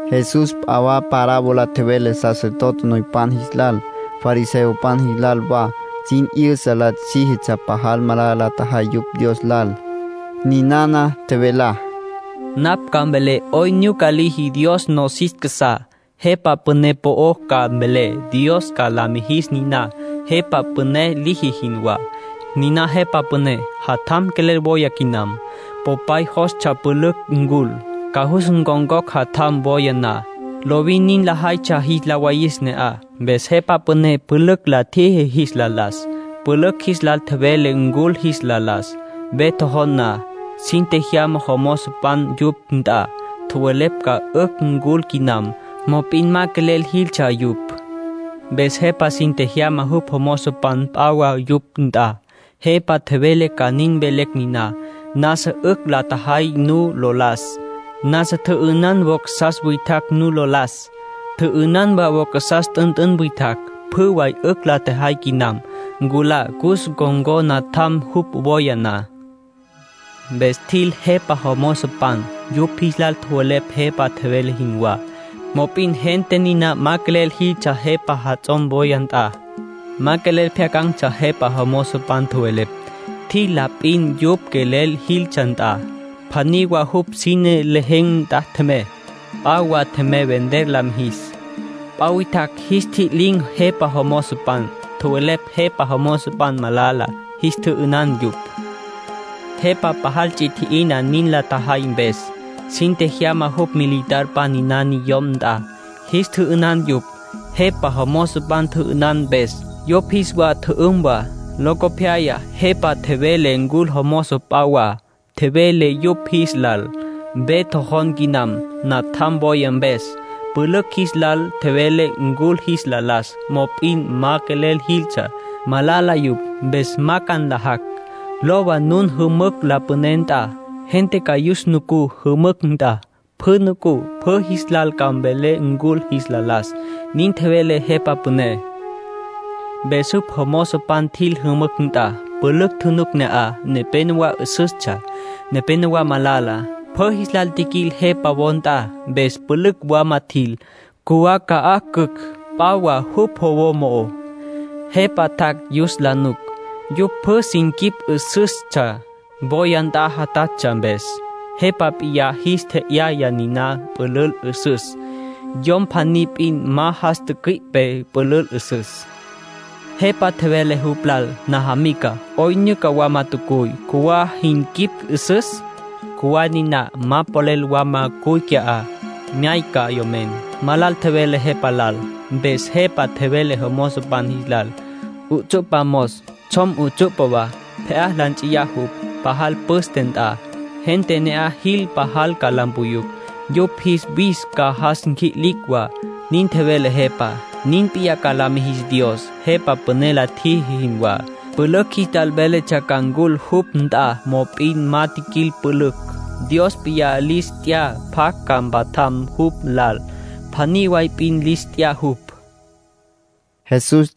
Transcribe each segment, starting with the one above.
Jesús p'a wa parábola tjevele sacerdote noypan jis lal, fariseopan jis lal wa. Sin 'yüsa la síjitsja pajal malala la tjajay yupj Dios lal. Ninana tjevelá: “Napj ca mvelé 'oyn nyuca liji Dios nosis casá. Jepa püné po'ó ca mvelé. Dios ca la mijis niná jepa püné liji jinwá. Niná jepa püné, jatjam quelel wóyatsja quinam. Popay jostsja pülücj ncul, ca cus ncon̈cocj jatjam, woya na. Lovin nin lajaytsja jis la wayis ne'aj. Mpes jepa püné pülücj la tjiji jis la las. Pülücj jis lal tjevele ncul jis la las. Ve tjojon na, sin tjejyama jomozopan yupj nt'a. Tjowelepj ca 'ücj ncul quinam. Mop'in ma quelel jiquiltsja yupj. ”Mpes jepa sin tjejyama jupj jomozopan p'a wa yupj nt'a. Jepa tjevele ca nin mvelecj niná: ‘Nasa 'ücj la tjejay nu lo las. Nasa tjü'ünan vaca witjacj nu lo las. Tjü'ünan wa vaca t'ünt'ün witjacj. Pjü way 'ücj la tjejay quinam. Nculá, cus ncon̈có natjam, jupj woya na.’ Mpes tjil jepa jomozopan. Yupj jis lal tjowelepj jepa tjevele jinwá. Mop'in gente niná ma quelel jiquiltsja jepa jatjam wóyatsja nt'a. Ma quelel pjyacan̈tsja jepa jomozopan tjowelepj. Tjil la p'in yupj quelel jiltsja nt'a. Pjaní wa jupj sine lejen̈ nt'a tjemey. P'a wa tjemey vender la mijis. P'a witjacj jis ntji'lin̈ jepa jomozopan. Tjowelepj jepa jomozopan malala. Jis tjü'ünan yupj. Jepa pajal ts'i tji'ina nin la tjajay mpes. Sin tjejyama jupj militarpan niná niyom nt'a. Jis tjü'ünan yupj, jepa jomozopan tjü'ünan mpes. Yupj jis wa tjü'üm wa. ”Locopyaya jepa tjevele ncul jomozopan p'a wa. Tjevele yupj jis lal: ‘Ve tjojon quinam, natjam woya mpes. Pülücj jis lal tjevelé ncul jis la las, mop'in ma quelel jiquiltsja. Malala yupj, mpes ma ca nlajacj. Lowa nun jümücj la püné nt'a. Gente ca yus nucú jümücj nt'a. Pjü nucú, pjü jis lal ca mvelé ncul jis la las’, nin tjevele jepa püné. Mpes jupj jomozopan tjil jümücj nt'a. Pülücj tjunuc ne'aj. Nepénowa 'üsüstsja, nepénowa malala. Pjü jis lal tjiquil jepa wo nt'a. Mpes pülücj wama tjil, cjuwá ca'aj cücj p'a wa jupj wo mo'ó. ”Jepa tjac' yus la nuc. Yupj pjü sin quip 'üsüstsja, woya nt'a játjatsja mpes. Jepa p'iyá jis tje'yaya niná pülül 'üsüs. Yom pjaní p'in ma jas tücüi'pe pülül 'üsüs. Jepa tjevele jupj lal: ‘Najamica ¿'oyn nyuca wama tjacuy, cjuwá jin quip 'üsüs? Cjuwá niná, ma polel wama cuy qui'á.’ Myáycatsja yomen. Ma lal tjevele jepa lal. ”Mpes jepa tjevele jomozopan jis lal: ‘'Utsu'pa mos, tsjom 'utsu'pa wa. Pje'á la nts'iyá jupj, pajal püste nt'a. Gente ne'aj jil pajal ca la mpuyucj. Yupj jis wis ca jas nqui'licj wa’, nin tjevele jepa. ”Nin p'iyá ca la mijis Dios, jepa püné la tjiji jinwá. Pülücj jis lal véletsja ca ncul jupj nt'a, mop'in ma jiquil pülücj. Dios p'iyá lis t'ya pjacj ca mpatjam jupj lal. Pjaní way p'in lis t'ya jupj”, nin tjevele Jesús.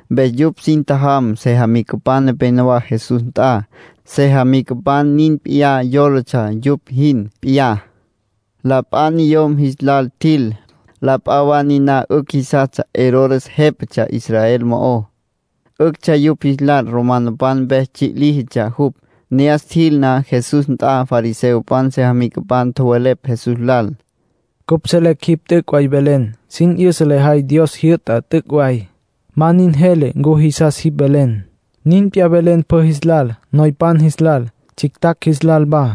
Mpes yupj sin tjajam sejamicapan nepenowá Jesús nt'a. Sejamicapan nin p'iyá yólatsja yupj jin p'iyá. La p'a niyom jis lal tjil. La p'a wa niná 'ücj jisastsja Herodes jépatsja Israel mo'ó. 'Üctsja yupj jis lal romanopan mpes tsji' líjitsja jupj. Ne'as tjil na Jesús nt'a, fariseopan sejamicapan tjowelepj Jesús lal: —Cupj selecj jipj t'üc' way velen. Sin 'yüsa lejay Dios jyü'tá t'üc' way. Ma nin jele ncu jisas jipj velen. Nin p'iyá velen pjü jis lal, noypan jis lal, tsjictjacj jis lal wa.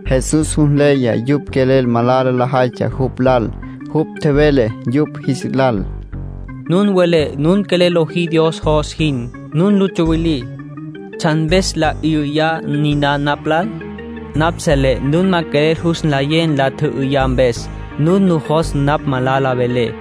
Jesús jus nleya yupj quelel malala lajaytsja jupj lal. Jupj tjevele yupj jis lal: —Nun welé nun quelel lojí Dios jos jin. Nun lu tsuwilí. ¿Tsjan mpes nla 'üyá niná napj lal? Napj selé nun ma quelel jus nlayé nla tjü'üyá mpes. Nun nujos napj malala velé.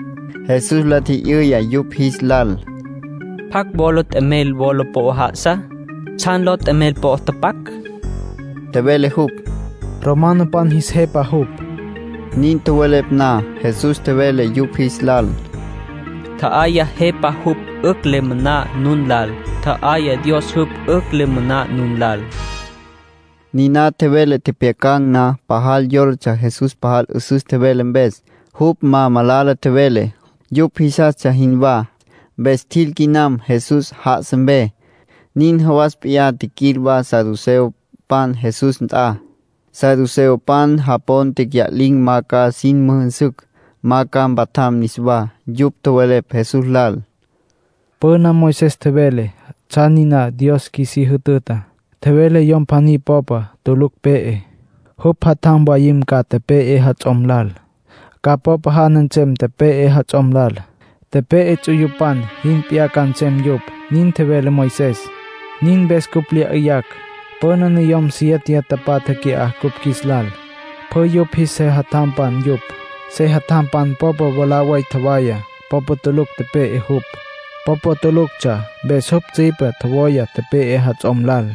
Jesús la tji'yüya yupj jis lal: —¿Pjacj wola t'emel wola po'ó já'asa? ¿Tsjan ló t'emel po'ó tapac? —tjevele jupj. —Romanopan jis jepa jupj —tjowelepj yupj. Nin tjowelepj na, Jesús tjevele yupj jis lal: —Tja'ayá jepá jupj 'ücj le moná nun lal. Tja'ayá Dios jupj 'ücj le moná nun lal —tjevele. Niná tjevele tjepjyacan̈ na, pajal yólatsja Jesús pajal 'üsüs tjevele mpes. Jupj ma malala tjevele, yupj jisastsja jinwá. Mpes tjil quinam Jesús já'asa mpe. Nin jawas p'iyá tjiquil wa saduceopan Jesús nt'a. Saduceopan japon tecya'lin̈ ma ca sin müjünsücj, ma ca mpatjam niswá. Yupj tjowelepj Jesús lal: —Püna Moisés tjevele tsjan niná Dios qjuisí jütüta. Tjevele yom pjaní popa tulucj pe'e, jupj jatjam mwayim ca, tepe'e jats'om lal. Ca popa jana nsem tepe'e jats'om lal. Tepe'e juts'uyupan jin p'iyá ca nsem yupj, nin tjevele Moisés. Nin mpes cupj lya 'yüyacj. Püna niyom siéteya tapatja qui'á cupj qjuis lal. Pjü yupj jis sejatjampan yupj. Sejatjampan popa mwalá way tjowaya. Popa tulucj tepe'e jupj. Popa tuluctsja, mpes jupj tsüipe tjowaya tepe'e jats'om lal.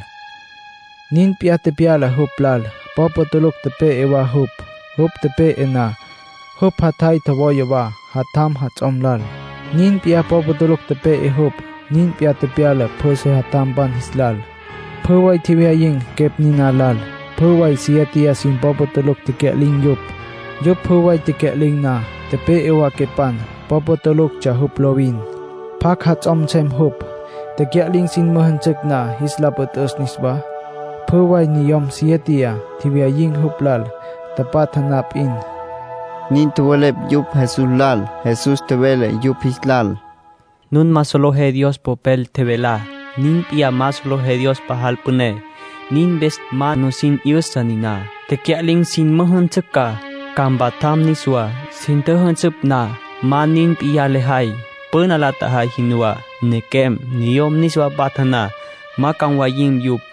Nin p'iyá tepyala jupj lal. Popa tulucj tepe'e wa jupj. Jupj tepe'e na, jupj jatjay tjowaya wa jatjam jats'om lal. Nin p'iyá popa tulucj tepe'e jupj. Nin p'iyá tepyala pjü sejatjampan jis lal. Pjü way tjewyayin̈ quepj niná lal. Pjü way siéteya sin popa tulucj tecya'lin̈ yupj. Yupj pjü way tecya'lin̈ na, tepe'e wa quepan. Popa tuluctsja jupj lovin. ¿Pjacj jats'om nsem jupj, tecya'lin̈ sin müjünsücj na jis la püt'üs niswá? Pjü way niyom siéteya tjewyayin̈ jupj lal, tapatja na p'in —nin tjowelepj yupj Jesús lal. Jesús tjevele yupj jis lal: —Nun ma solejé Dios Popel tjevelá. Nin p'iyá ma solejé Dios pajal püné. Nin mpes ma nusin 'yüsa niná. Tecya'lin̈ sin müjünsücj ca, ca mpatjam niswá. Sin tjüjünsüpj na, ma nin p'iyá lajay, püna la tjajay jinwá. Nequem, niyom niswa patja na, ma ca mwayin̈ yupj.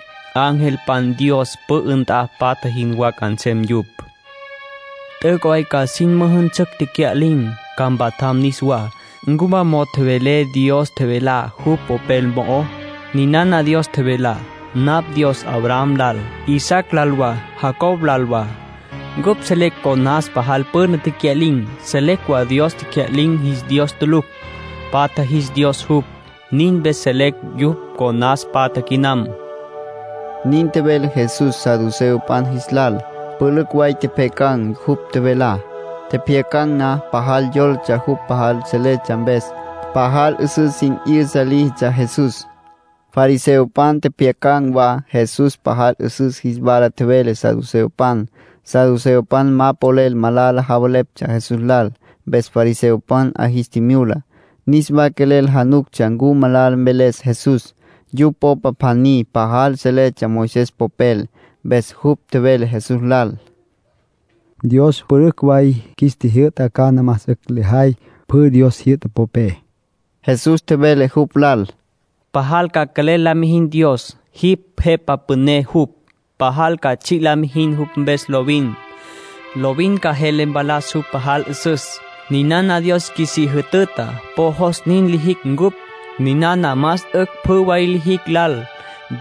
Angelpan Dios pü'ü nt'a patja jinwá ca nsem yupj. T'üc' way ca sin müjünsücj tecya'lin̈, ca mpatjam niswá. ¿Ncu ma mo'o tjowelé Dios tjevelá jupj Popel mo'ó? Ninana Dios tjevelá: ‘Napj Dios Abraham lal, Isaac lal wa, Jacob lal wa’. Cupj selecj conas pajal püna tecya'lin̈. Selecj wa Dios tecya'lin̈ jis Dios tulucj. Patja jis Dios jupj. Nin mpes selecj yupj conas patja quinam —nin tjevele Jesús saduceopan jis lal. Pülücj way tjepjyacan̈ jupj tjevelá. Tjepjyacan̈ na, pajal yólatsja jupj pajal seletsja mpes. Pajal 'üsüs sin 'yüsa líjitsja Jesús. Fariseopan tjepjyacan̈ wa Jesús pajal 'üsüs jis wala tjevele saduceopan. Saduceopan ma polel malala javeleptsja Jesús lal. Mpes fariseopan 'a jis tjimyula. Niswa quelel januctsja ncu malala mveles Jesús. Yupj popa pjaní pajal seletsja Moisés popel. Mpes jupj tjevele Jesús lal: —Dios pülücj way qjuis tjijyü'ta. ¿Cana más 'ücj jis la jay pjü Dios tjijyü'ta popé? Jesús tjevele jupj lal: —‘Pajal ca quelel la mijin Dios, jipj Jepa Püné jupj. Pajal ca tsji' la mijin jupj mpes lovin. Lovin ca jele mpalas jupj pajal 'üsüs.’ Ninana Dios qjuisí jütüta, po jos nin lijicj cupj. Ninana lijicj más 'ücj pjü way lijicj lal.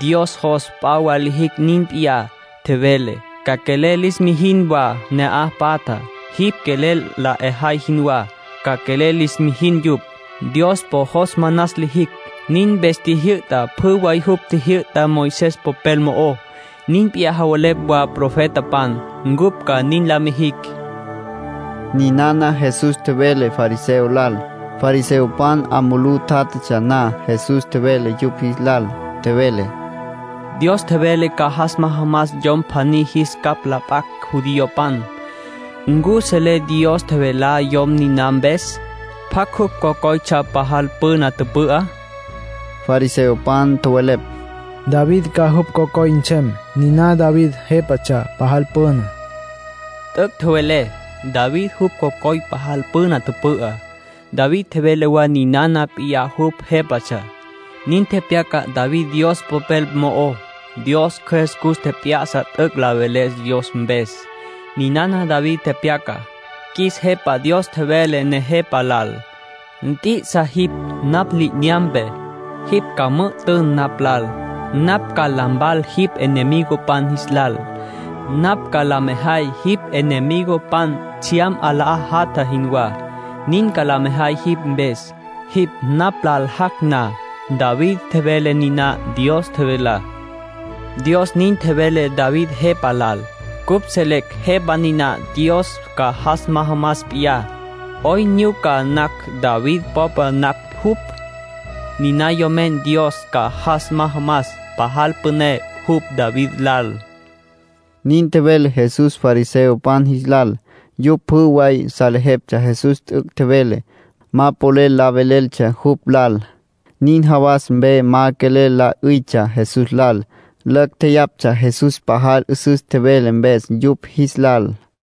Dios jos p'a wa lijicj nin p'iyá. Tjevele: ‘Ca quelel lis mijin wa ne'aj patjá. Jipj quelel la 'ejay jinwá ca quelel lis mijin yupj.’ Dios po jos manas lijicj. Nin mpes tjijyü'ta pjü way jupj tjijyü'tá Moisés popel mo'ó. Nin p'iyá tjowelepj wa profetapan, cupj ca nin la mijicj —ninana Jesús tjevele fariseo lal. Fariseopan 'a mulú tjátjatsja na, Jesús tjevele yupj jis lal. Tjevele: —Dios tjevele ca jas majamas yom pjaní jis capj la p'acj judiopan. ¿Ncu solejé Dios tjevelá yom niná mpes? ¿Pjacj jupj cocoytsja pajal püna tüpü'á? Fariseopan tjowelepj: —David ca jupj cocoy nsem, niná David jépatsja pajal püna. —T'üc' tjowelé —tjevele Jesús—. David jupj cocoy pajal püna tüpü'á. David tjevele wa ninana p'iyá jupj jépatsja. Nin tepyaca David Dios Popel mo'ó. Dios Cjües cus tjep'ya'sa t'üc' la veles Dios mpes. Ninana David tepyacá: ‘Qjuis Jepa Dios tjevele Nejepa lal: “Nt'i'isa jipj napj li'inyampe. Jipj ca müjü'tün napj lal. Napj ca la mpalan jipj enemigopan jis lal. Napj ca la mejay jipj enemigopan tsjyam 'alá jatja jinwá. Nin ca la mejay jipj mpes, jipj napj lal jac' na.” ’ David tjevele niná Dios tjevelá. Dios nin tjevele David jepa lal. Cupj selecj Jepa niná Dios ca jas majamas p'iyá. ¿'Oyn nyuca nacj David popa nacj jupj? Niná Yomen Dios ca jas majamas, pajal püné jupj David lal —nin tjevele Jesús fariseopan jis lal. Yupj pjü way salejeptsja Jesús t'üc' tjevele. Ma polel la veleltsja jupj lal. Nin jawas mpe ma quelel la 'üytsja Jesús lal. Lacj tjeyaptsja Jesús pajal 'üsüs tjevele mpes yupj jis lal.